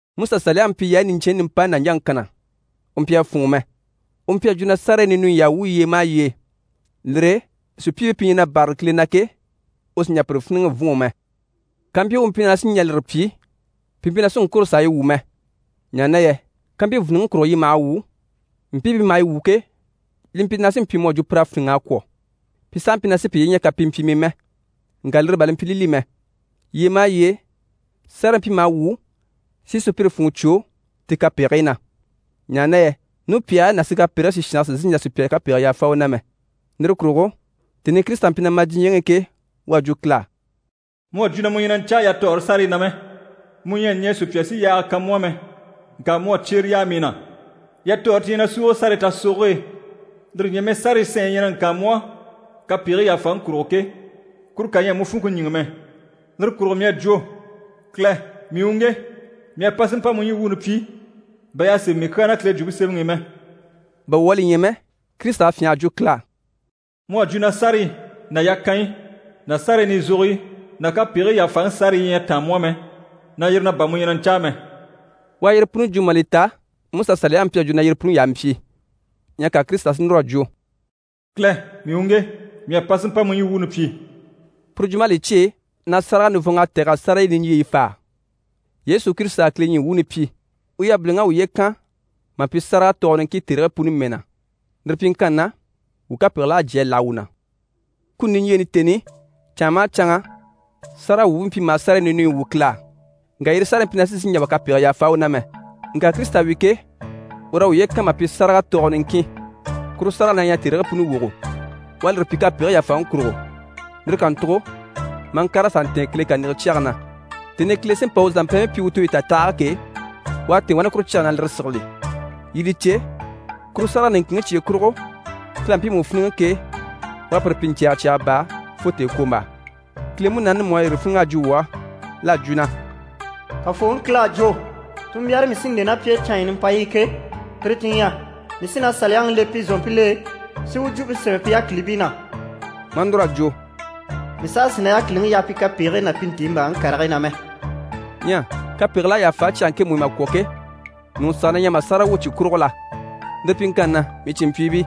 MusaSaliyaŋi mpyi yaayi niɲcɛnɲyi nimpayi nàɲjaŋi kanna, u mpyi a fûnŋɔ mɛ. U mpyi a jwo na sárayi ninuyi y'à wwû yyee maha yyee. Lire e sùpyiibii pi ɲyɛ na bârali Kile na ke, u sì n‑jà pire fíniŋɛ n-fûnŋɔ mɛ. Kàmpyi u mpyi na sí n‑jà lire pyi, pi mpyi na sí n‑kwôro s'a yi wwû mɛ. Ɲaha na yɛ kàmpyi vìniŋi kurugo yi maha wwû, mpii pi maha yi wwû ke, li mpyi na sí n‑pyi mu à jwo pir'à fíniŋ'a kwɔ̀, pi sàha mpyi na sí piye ɲya kapimpyii mɛ. Ŋka lire bà li mpyi li li mɛ. Yyee maha yyee, sárayi mpyi maha wwû si sùpyire funŋɔ cwo ti kapegigii na. Ɲaha na yɛ nupyahigii ná sikapɛrigii sìshange sì n‑sìi n‑jà sùpya kapegii yàfa u na mɛ. Lire kurugo tèni i Kirisita mpyi na ma diɲyɛŋi i ke, u à jwo Kile á: «Mu à jwo na mu ɲyɛ na ɲcaa yatɔɔre sárayi na mɛ, mu ɲyɛ a ɲɛɛ sùpya si yaaga kan mu á mɛ, ŋka mu à cyere yaa mii na. Yatɔɔre ti ɲyɛ na súuge sárayi tasogoge e, lire ɲyɛ mɛ sárayi sanɲyi yi ɲyɛ na ŋkaan mu á kapegigii yàfaŋi kurugo ke, kuru kà ɲyɛ a mu funŋke ɲíŋɛ mɛ. Lire kurugo mii à jwo “Kile, mii u ŋge, mii à pa si mpa mu ɲyii wuuni pyi, bà y'à sémɛ mii kyaa na Kile Jwumpe Semɛŋi i mɛ.”» Bà wuu à li ɲya mɛ, Kirisita à fyânha a jwo Kile á: «Mu à jwo na sárayi ná yakanyi ná sárayi nizogoyi ná kapegigii yàfaŋi sárayi ɲyɛ a táan mu á mɛ, na yire na bà mu ɲyɛ na ɲcáa mɛ.» U à yire puni jwo mà li ta MusaSaliyaŋi à jwo na yire puni y'a mpyi. Ɲyɛ ka Kirisita si núr'a jwo: «Kile, mii u ŋge, mii à pa si mpa mu ɲyii wuuni pyi.» Puru jwump'à li cyêe na sáraga nivɔnŋ'à tɛ̀g'a sárayi niɲjyeyi fáa. Yesu Kirisita à Kile ɲyii wuuni pyi. U yabiliŋ'à uye kan mà pyi sáraga tɔɔgɔ niŋkin tèrigii puni mɛɛ na, lire pyiŋkanni na wuu kapegigil'à jyé a láha wuu na. Kuni niɲjyeeni tèni i, canŋa maha canŋa, sáragawwuubii mpyi maha sárayi ninuyi wwû Kile á, ŋka yire sárayi mpyi na sì n‑sìi n‑jà wà kapegigii yàfa u na mɛ. Ŋka Kirisita wi ke, ur'à uye kan mà pyi sáraga tɔɔgɔ niŋkin, kuru sárage na ɲyɛ tèrigii puni wogo. U à lire pyi kapegigii yàfaŋi kurugo, lire kàntugo maa ŋkàr'a sà ntɛ̀ɛn Kile kàniŋɛ cyɛge na. Tèni i Kile sí n‑pa u zàmpɛɛnbii pyi u tooyi tatahage ke, u à tɛ̀ɛn wani kuru cyage e na lire sigili. Yii li cè, kuru sárage niŋkinŋi cye kurugo, Kile à mpiimu fíniŋɛ ke, u à pire pyi ɲcɛ̀ɛgɛ cyaga baa fo tèekwombaa. Kile Munaani mú à yire fíniŋ'a jwo wuu á. L'à jwo na: «Kafooŋi Kile à jwo “Tunmbyaare mii sí n‑le ná pi e canɲyi nimpayi i ke, tire ti ɲyɛ: ‘Mii sí na Saliyaŋi le pi zòompil'e, si u jwumpe sémɛ pi yákilibii na.’”» Maa núr'a jwo: «Mii saha sì na yákiliŋi yaha pi kapegigii ná pi ntiimbaaŋi karigii na mɛ.» Ɲyɛ kapegigil'à yàfa cyage ŋkemu i mà kwɔ̀ ke, ɲùŋɔ saha na ɲyɛ mà sáraga wwû cyi kurugo la? Lire pyiŋkanni na, mii cìnmpyiibii,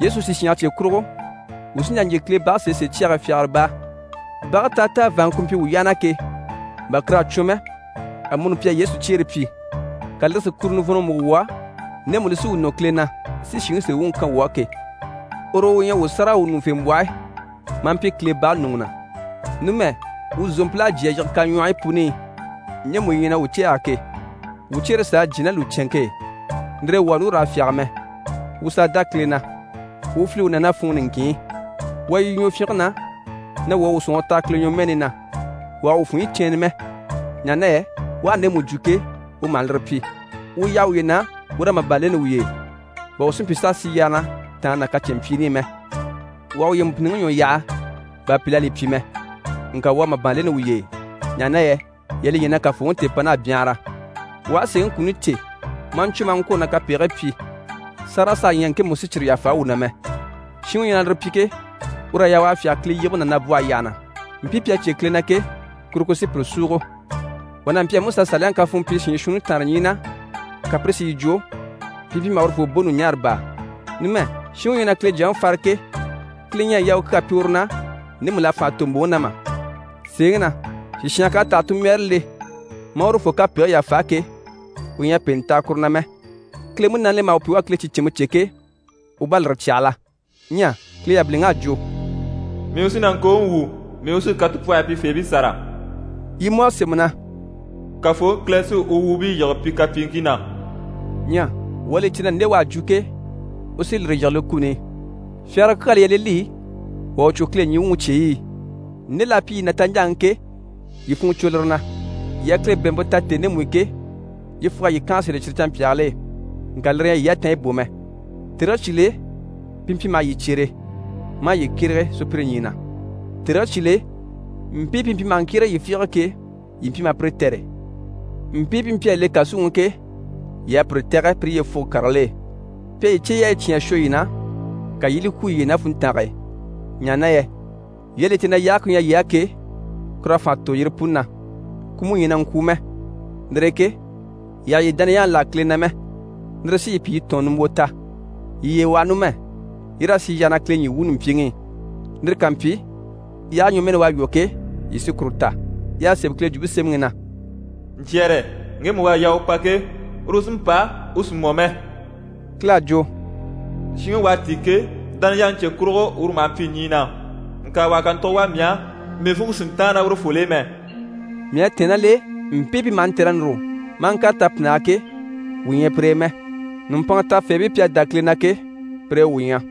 Yesu sìshange cye kurugo, wuu sí n‑jà n‑jyè Kile bage sèesee cyage e fyagara baa. Bage táataa vàanŋke ku mpyi wuu yyaha na ke, bà kur'à cwɔn mɛ, amuni pi à Yesu cyeere pyi, ka lire si kuro nivɔnnɔ múgo wuu á ndemu li sí wuu nɔ Kile na, si shìŋi sèe wuŋi kan wuu á ke. Uru u ɲyɛ wuu sáragawwuɲuŋufembwɔhe maa mpyi Kile bage ɲùŋɔ na. Numɛ, wuu zòompil'à jyé a yige kaɲwɔhɔyi puni i ɲjemu yi ɲyɛ na wuu cɛ̂ɛge ke, wuu cyeere s'à jyé ná lùcɛnŋke e. Lire e wuu àha núru raa fyáge mɛ, wuu sàa dá Kile na, wuu u file u na ná funŋɔ niŋkin i. Wuu a yi yu ɲwɔfyinge na, na wuu à wuu sɔ̀nŋɔre taha Kile ɲwɔmɛɛni na. Wuu àha wuu funɲyi cɛɛnnɛ mɛ, ɲaha na yɛ u aha ndemu jwo ke, u maha lire pyi. Wuu yaha wuye na wuu raa màban leni wuye e, bà wuu si mpyi s'a sì yyaha na tàange ná kacɛnmpyiini i mɛ. Wuu àha wuye mbìnniŋi ɲwɔ yaha bà pìl'à li pyi mɛ, ŋka wuu a màban leni wuye e, ɲaha na yɛ yii à li ɲya na Kafooŋi tèepan'à byanhara. Wuu aha sèeŋi kuni cè maa ɲcwɔ́ maa ŋkwôro na kapegigii pyi, sáraga saha ɲyɛ ŋkemu ku sí cyire yàfa wuu na mɛ. Shinŋi u ɲyɛ na lire pyi ke, ur'à yaa u a fyáge Kile yibige ná nabwɔhe yyaha na. Mpii pi à cyé Kile na ke, kuru ku sí pire súugo. Wà n'a mpyi a MusaSaliyaŋi kafuun pyi shiin shuunni taanre ɲyii na, ka pire si yi jwo, pi mpyi maha urufoo bò ɲùɲaara baa. Numɛ, shinŋi u ɲyɛ na Kile Jyaŋi fare ke, Kile ɲyɛ a yaa u kyaa pyi uru na ndemu l'à fànha tò mbòŋi na mà? Sèeŋi na, sìshange k'à tɛ̀g'a tunmbyaare le maa urufoo kapegigii yàfa ke, u ɲyɛ a pèenɛ taha kuru na mɛ. Kile Munaani li maha wuu pyi wuu à Kile ticɛnmpe cè ke, u bá à lire cyahala. Ɲyɛ Kile yabiliŋ'à jwo: «Mii u sí na ŋkooŋi wwû. Mii u sí katupwɔhɔyi pyifeebii sâra.» Yi mú à sémɛ na: «Kafooŋi Kile sí u wuubii yíbe pi kapyiiŋkii na.» Ɲyɛ wuu à li cè na nde u à jwo ke, u sí lire yige li kuni i. Fyagara kyaa li ɲyɛ li li wà u cwo Kile ɲyii wuŋi cyeyi i. Nde l'à pyi yii na taɲjaaŋi i ke, yii funŋɔ cwo lire na. Yii à Kile bɛ̀ɛnmpe ta tèni ndemu i ke, yyefug'à yii kànha sèl'e cyire canmpyaagil'e, ŋka lire ɲyɛ a yii yatanɲyi bò mɛ. Tèrigii cyìl'e, pi mpyi maha yii cyere, maa yii kyérege sùpyire ɲyii na. Tèrigii cyìl'e, mpii pi mpyi maha ŋkyérege yii fiige ke, yii mpyi maha pire tɛ̀re. Mpii pi mpyi a le kàsuŋi i ke, yii à pire tɛ̀gɛ pire yyefugo karigil'e. Pi à yii cyeyaayi cyán a shwɔ yii na, ka yii i li kwú yiye e ná funntange e, ɲaha na yɛ yii à li cè na yaage ku ɲyɛ yii á ke, kur'à fànha tò yire puni na, ku mú ɲyɛ na ŋkwùu mɛ. Lire e ke yii àha yii dániyaŋi láha Kile na mɛ, lire sí yii pyi yii tɔ̀ɔn nimbwo ta. Yii yiye waha numɛ, yii raa sì yyaha na Kile ɲyii wuuni mpyiŋi i, lire ká mpyi, yaage ɲwɔmɛɛni u à lwɔ́ ke, yii sí kuru ta. Y'à sémɛ Kile Jwumpe Semɛŋi i na: «Ɲcyɛ̀rɛ, ŋgemu u à yaa u pa ke, uru sí n‑pa, u sì mɔ mɛ.» Kile à jwo: «Shinŋi u à tíi ke, dániyaŋi cye kurugo uru maha mpyi ɲyii na. Ŋka wà ha kàntugo wà mii á, mii funŋke sì n‑táan ná urufol'e mɛ.» Mii à tɛ̀ɛn ná l'e, mpii pi maha ntɛ̂r'a núru maa ŋkàre tapinnage e ke, wuu ɲyɛ pire e mɛ. Nùmpanŋa tafeebii pi à dá Kile na ke, pire e wuu ɲyɛ.